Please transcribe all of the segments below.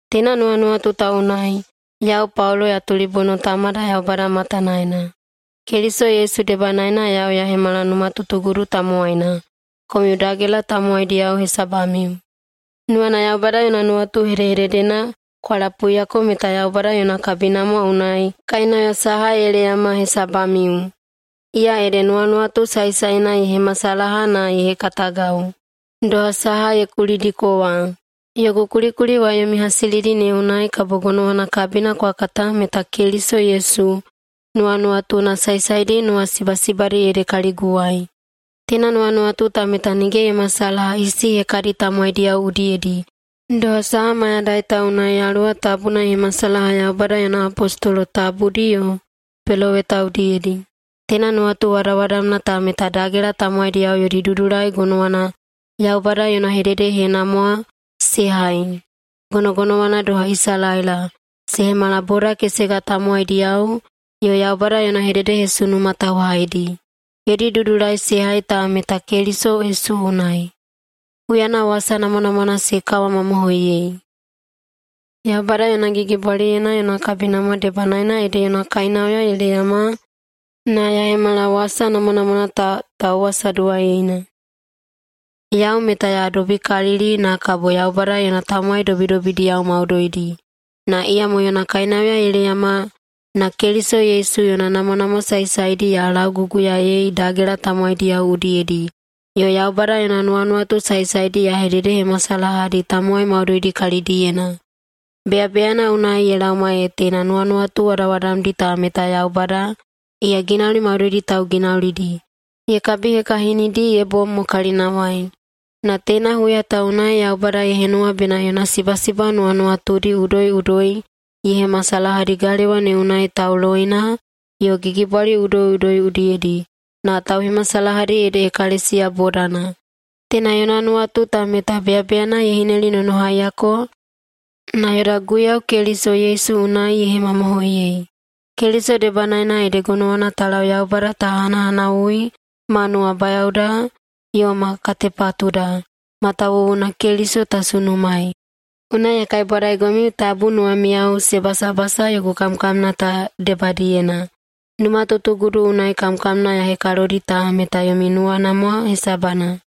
Teina nuwanuwatu ta unai, yau Paulo [ya tulibono Tamada Yaubada matanaena]. Keliso Yesu debanaena yau ya hemala numatutugudu tamowaina, komiu dagela tamowaidiyao hesabamiu. Nuwana Yaubada yona nuwatu hedehededena kwa lapuiyako meta Yaubada yona kabinamwa unai kainauya saha ye leyama hesabamiu, iya ede nuwanuwatu saesaena ye hemasalaha na ye hekatagau, doha saha ya kulidiko wa. Yogu kulikuli wa yomi hasilidi ne unai kabo gonowana kabina kwa kata meta Keliso Yesu nuwanuwatuna saesaedi nuwasibasibadi ede kaliguwai. Teina nuwanuwatu ta meta nige ye masalaha isi hekadi tamowaidiyao udiyedi, doha saha mayadai ta unai Yaluwa Tabuna ye hemasalaha Yaubada yona apostolo tabudi yo peloweta udiyedi. Teina nuwatu wadawadamna ta meta dagela tamowaidiyao yodi dudulai gonowana Yaubada yona hededehenamwa se hai, gonogonowana doha Isalaela, se hemala boda kesega tamowaidiyao yo Yaubada yona hededehesunuma tauhaidi. Yodi dudulai se hai ta meta Keliso Yesu unai, huyana wasa namwanamwana se kawamamohoiyei. Yaubada yona gigibwaliyena yona kabinamwa debanaena ede yona kainauya ye leyama na ya hemala wasa namwanamwana ta tauwasaduwaiyeina. Yau meta ya dobikalili na kabo Yaubada yona tamowai dobidobidiyao maudoidi, na iyamo yona kainauya ye leyama na Keliso Yesu yona namwanamwa saesaedi ya lauguguyaei dagela tamowaidi udiyedi, yo Yaubada yona nuwanuwatu saesaedi ya hededehemasalahadi tamowai maudoidi kalidiyena. Beyabeyana unai ye laoma ee teina nuwanuwatu wadawadamdi ta meta Yaubada, iya ginauli maudoidi tauginaulidi, ye kabihekahinidi ye bom mo kalinawai. Na teina huya ta unai Yaubada ye henuwa bena yona sibasiba nuwanuwatudi udoiꞌudoi ye hemasalahadi galewa ne unai tauloina yo gigibwali udoiꞌudoi udiyedi, na tauhemasalahadi ede ekalesiya bodana. Teina yona nuwatu ta meta beyabeyana ye hinelinonohaiyako na yoda Guiyau Keliso Yesu unai ye hemamohoiyei. Keliso debanaena ede gonowana ta lau Yaubada ta hanahanawui ma nuwabayaoda yo ma katepatuda, matawuwuna Keliso ta sunumaei. Unai ya kaibwadaigomiu tabu nuwamiyao se basabasa yogu kamkamna ta debadiyena. [Numatutugudu unai kamkamna ya hekalodi ta] meta yomi namwanamwa hesabana.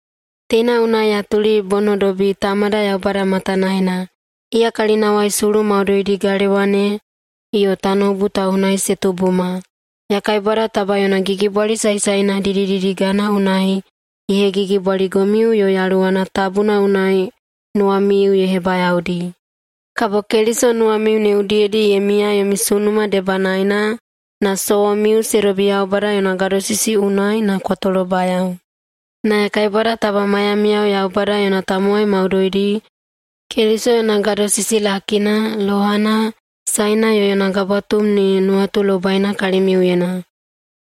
Teina unai ya tulibonodobi Tamada Yaubada matanaena. Iya kalinawai sulu maudoidi galewa ne yo tanoubu ta unai se tubuma. Ya kaibwada taba yona gigibwali saesaena didididigana unai ye hegigibwaligomiu yo Yaluwana Tabuna unai nuwamiu ye hebayaodi. Kabo Keliso nuwamiu ne udiyedi ye miya yomi sunuma debanaena na sowomiu se dobi Yaubada yona gadosisi unai na kwa tolobayao. Na ya kaibwada taba maiyamiyao Yaubada yona tamowai maudoidi, Keliso yona gadosisi lakina, lohana, saena yo yona gabwatum ne nuwatulobaina kalimiuyena.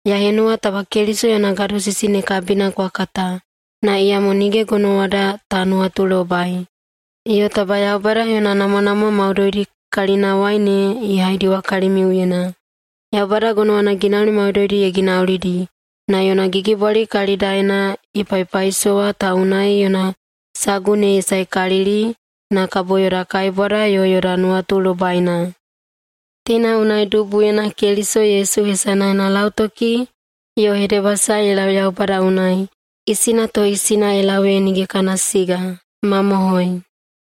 Ya henuwa taba Keliso yona gadosisi ne kabina kwa kata, na iyamo nige gonowada ta nuwatulobai. Yo taba Yaubada yona namwanamwa maudoidi kalinawai ne ye haidiwa kalimiuyena. Yaubada gonowana ginauli maudoidi ye ginaulidi, na yona gigibwali kalidaena ye paipaisowa ta unai yona sagu ne ye saekalili na kabo yoda kaibwada yo yoda nuwatulobaina. Teina unai dubuyena Keliso Yesu hesanaena lautoki yo hedebasae ye lau Yaubada unai, isina to isina ye lau ee nige kana siga. Mamohoi.